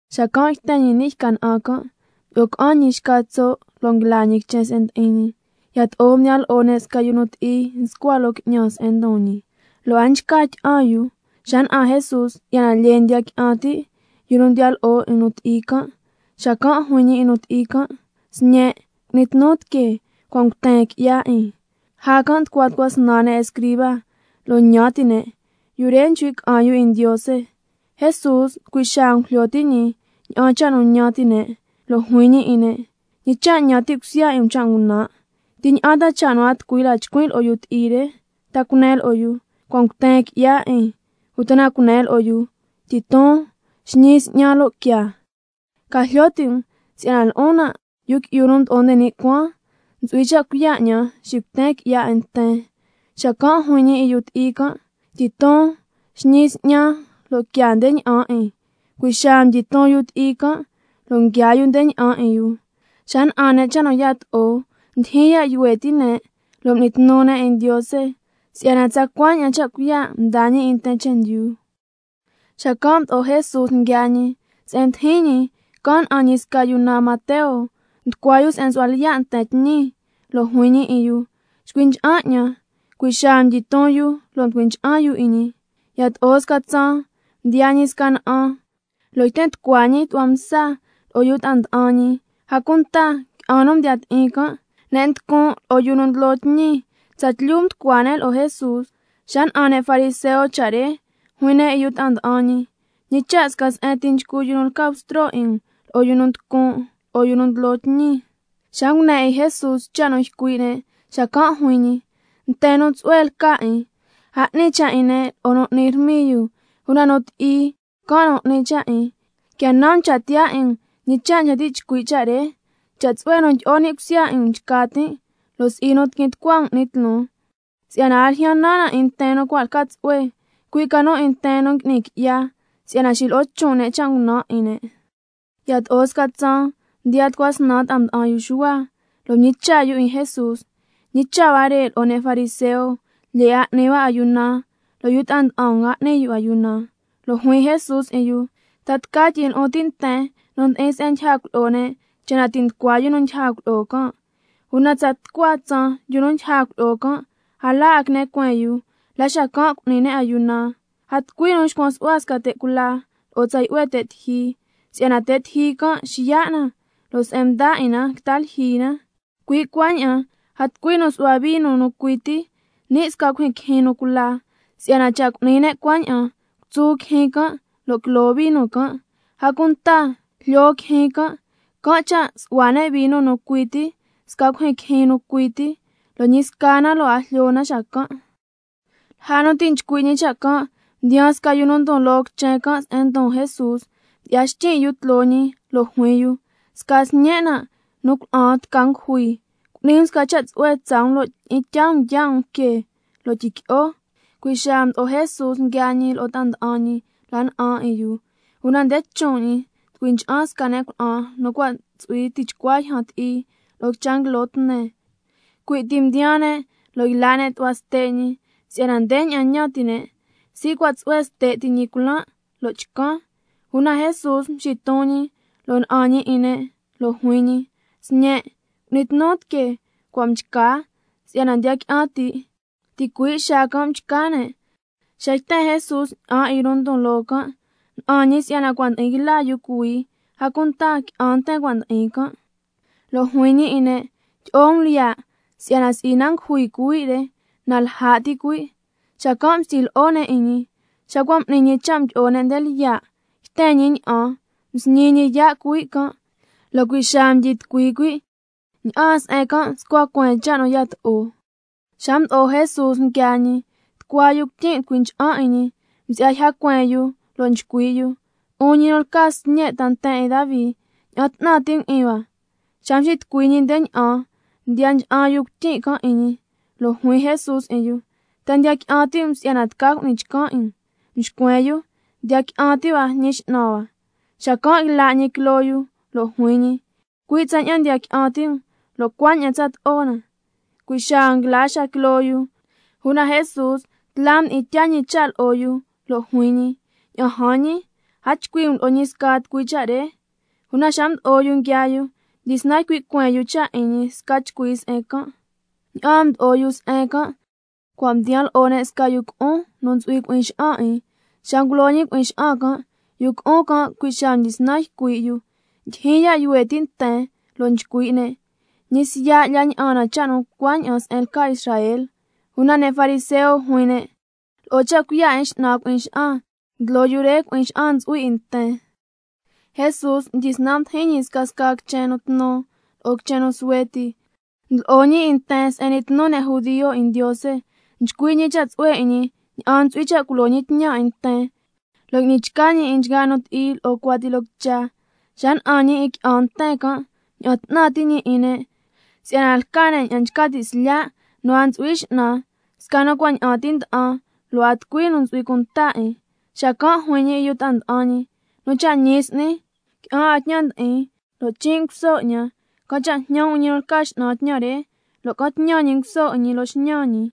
Xacan' yten ñi ni' yca na'an can', mdyi'o ca'an ñi xca tso' lo' nguila ñi quichen se'en ndi'in ñi. Yato'o mdiyan lo'o ne' sca yu ti'i nscua loo qui'ñan se'en ndon ñi, lo' a nchca tyi'an yu. Xa na'an Jesús si'yana lyee ndiya qui'an ti' yu nu ndiya lo'o 'in nu ti'i can', xacan' juin ñi 'in nu ti'i can': Sñen', cu'ni tnu tiquee, cua' nguten qui'ya 'in. Lja can' nducua tucua snan ne' escriba, lo' ñan ti' ne': Yu re, nchcui' ca'an yu 'in Ndiose. Jesús, cui' xaa ngujlyo ti' ñi ña'an cha' nu ñan ti' ne', lo' juin ñi 'in ne': ¿Ñi cha' ñan ti' cusya 'in um cha' ngunan'? ¿Ti ña'an ta cha' a tucui la chcuin' lo'o yu ti'i re: Ta cunen lo'o yu, cua' nguten qui'ya 'in, uta na cunen lo'o yu, tyiton, xñi s'ñan lo' quiaa? Ca jlyo ti' um si'yana lo'on nan', Yu Qui'yu nu Mdo'o nde ni' Cuaan, ntsu'hui cha' cuiya' 'ñan xicuten qui'ya 'in nten, (xacan' juin ñi 'in yu ti'i can'): Tyiton, xñi s'ñan lo' quiaa nde ña'an 'in. Cui' xaa mdyiton yu ti'i can', lo' nguiaa yu nde ña'an 'in yu. Xa na'an ne' cha' nu yato'o, ndyijyin ya' yuhue ti' ne lo' m'ni tnu ne' 'in Ndiose, si'yana tsacua ña'an cha' cuiya' mdaa ñi 'in nten chendyu. Xacan' mdo'o Jesús nguiaa ñi, se'en mdijin ñi, can' na'an ñi sca yu naan Mateo, nducua yu se'en nsu'hua lyiya' nten tñi, lo' juin ñi 'in yu: Chcui ncha'an 'ñan. Cui' xaa mdyiton yu lo' mducui ncha'an yu 'in ñi. Yato'o sca tsaan mdiyaa ñi sca na'an, lo' yten tucua ñi tu'hua msa lo'o yu ta'an nda'an ñi, a cunta qui'an nu mdiya ti'in can', ne' nducun' lo'o yu nu ndlo tñi, tsatlyu mducua ne' lo'o Jesús. Xa na'an ne' fariseo cha' re, juin ne' 'in yu ta'a nda'an ñi: ¿Ñi cha' sca se'en ti nchcu yu nu lca Bstro 'in um lo'o yu nducun', lo'o yu nu ndlo tñi? Xa ngune 'in Jesús cha' nu ycui' ne', xacan' juin ñi: Nten nu tsu'hue lca 'in, a 'ni cha' 'in ne' lo'o nu n'ni rmiyu, una nu ti'i can' nu 'ni cha' 'in. Quia nan um cha' tiyaa 'in um ñi cha' nchca ti' chcui' cha' re: —Cha' tsu'hue nu tyi'o ni' cusya 'in um nchca tin', lo' si'i nu tiquin tucua um 'ni tloon—. Si'yana a ljyan nan 'in nten nu cua' lca tsu'hue, cui' ca nu 'in nten nu ngui'ni qui'ya, si'yana xilo'o chon' ne' cha' ngunan' 'in ne'. Yato'o sca tsaan mdiyaa tucua snan ta'a nda'an yu Xuhua, lo' mñicha' yu 'in Jesús: ¿Ñi cha' huare' lo'o ne' fariseo lyee 'a n'ni hua ayuna, lo' yu ta'a nda'an um a n'ni yu ayuna? Lo' juin Jesús 'in yu: ¿Ta tca tyi'in lu'un ti' nten nu ndi'in se'en ndyija cuilyi'o ne', cha' na ti' nducua yu nu ndyija cuilyi'o can'? Una tsa tucua tsaan, yu nu ndyija cuilyi'o can', a la 'a quine cueen yu, la xacan' cu'ni ne' ayuna. A tucui nu nxcuan su'hua sca te' cula lo'o tsa yu'hue te' tiji, si'yana te' tiji can' xiya' na, lo' se'en mda' 'in na quita lyijyi na. Cui' cuaña'an a tucui nu nsu'hua vino nu cui ti ni' sca cuijyin quijyin nu cula, si'yana cha' cu'ni ne' cuaña'an, cutsu quijyin can' lo' quilo vino can', a cunta jlyo quijyin can'. Can' cha' nsu'hua ne' vino nu cui ti ni' sca cuijyin quijyin nu cui ti, lo' ñi sca na lo' a jlyo na xacan'. Lja nu ti' nchcui' ñi cha' can' mdiyaan sca yu nu ndon loo quichen can' se'en ndon Jesús, mdyi'ya xtyin' yu tloo ñi lo' juin yu: Sca sñen' nan' nu cuna'an tca ngujui, cu'ni um sca cha' tsu'hue tsaa um lo' tyi'in tyaa um yaa' um que, lo' tyiqui'o. Cui' xaa mdo'o Jesús nguiaa ñi lo'o ta'a nda'an ñi la na'an 'in yu. Una nde chon' ñi mducui ncha'an sca ne' cuna'an, nu cua' ntsu'hui tichcua yjan ti'i lo'o quicha nguilo tne, cui' ti mdiyaa ne' lo' yla' ne' tu'hua ste' ñi, si'yana ndeña'an ñan ti' ne': Si cua' tsu'hue ste' ti ñi culan', lo' chcan. Una Jesús mxiton ñi lo' na'an ñi 'in ne', lo' juin ñi: Sñen', cu'ni tnu tiquee, cua' mchca si'yana ndiya qui'an ti'. Ticui' xaa can' mchca ne'. Xa yten Jesús ña'an 'in yu nu ndon loo can', na'an ñi si'yana cua' ndi'in yla yu cuhuii, a cunta qui'an nten cua' ndi'in can'. Lo' juin ñi 'in ne': Quia lya um, si'yana si'i na ngujui cuhui' re, na lja' ti cuhui'. Xacan' mstyi lyi'o ne' 'in ñi. Xa cua' m'ni ñi cha' mdyi'o ne' nde lyiya', yten ñi ña'an, msñi ñi yaa' cuhui' can', lo' cui' xaa mdyitucui cuhui'. Ña'aan se'en can' mscua cueen cha' nu yato'o. Xa mdo'o Jesús nguiaa ñi, tucua yu cuityin' mducui ncha'an 'in ñi, msi'ya yja cueen yu, lo' nchcui' yu: 'Un ñi nu lca Sñe' ta nten 'in Davi, ña'an 'tnan ti' um 'in hua. Xa mxitucui ñi nde ña'an, mdiya ncha'an yu cuityin' can' 'in ñi, lo' juin Jesús 'in yu: ¿Ta ndiya qui'an ti' um si'yana tca cu'ni chcan 'in um? Mxcuen yu: Ndiya qui'an ti' hua, Ñi X'nan hua. Xacan' yla' ñi quiloo yu lo' juin ñi: Cui' tsaña'an ndiya qui'an ti' um, lo' cuaña'an tsato'o na. Cui' xaa nguila xaa quiloo yu. Una Jesús tla mdi'in tyaa ñi cha' lo'o yu lo' juin ñi: Ña'an jan ñi, a chcui' um lo'o ñi sca tucui cha' re. Una xa mdo'o yu nguiaa yu, mdyisnan m'ni cueen yu cha' 'in ñi sca chcui se'en can'. Ña'aan mdo'o yu se'en can', cua' mdiyan lo'o ne' sca yu cu'un nu ntsu'hui cui'in xa'an 'in. Xa ngulo ñi cui'in xa'an can', yu cu'un can' cui' xaa mdyisnan ycui' yu. Ndyijyin ya' yuhue ti' nten lo' nchcui' ne': Ñi siya' lya ña'an na cha' nu cuaña'an se'en lca Israel. Una ne' fariseo juin ne': Lo'o cha' cuiya' 'in x'nan cui'in xa'an, ndlo yu re cui'in xa'an ntsu'hui 'in nten. Jesús mdyisnan mdijin ñi scasca quichen tnu lo'o quichen suhue ti, ndlo'o ñi 'in nten se'en n'ni tnu ne' 'in Ndiose, nchcui' ñi cha' tsu'hue 'in ñi ña'an ntsu'hui cha' culo ñi tñan 'in nten, lo' ngui'ni chca ñi 'in nchgaa nu ti'i lo'o cuati loo quicha. Xa na'an ñi 'in nten qui'an can' mña'an 'tnan ti' ñi 'in ne', si'yana lca ne' ña'an nchca ti' slya' nu a ntsu'hui x'nan, sca nu cua' ña'an nda'an ti, lo' a tucui nu ntsu'hui cunta 'in. Xacan' juin ñi 'in yu ta'a nda'an ñi: Nu cha' ñi s'ni, qui'an 'a tñan ndi'in lo' chin' nguso 'ñan. Can' cha' jñan um 'in ñi nu lca X'nan tñan re, lo' ca'an tñan ñi nguso 'in ñi loo xñan ñi.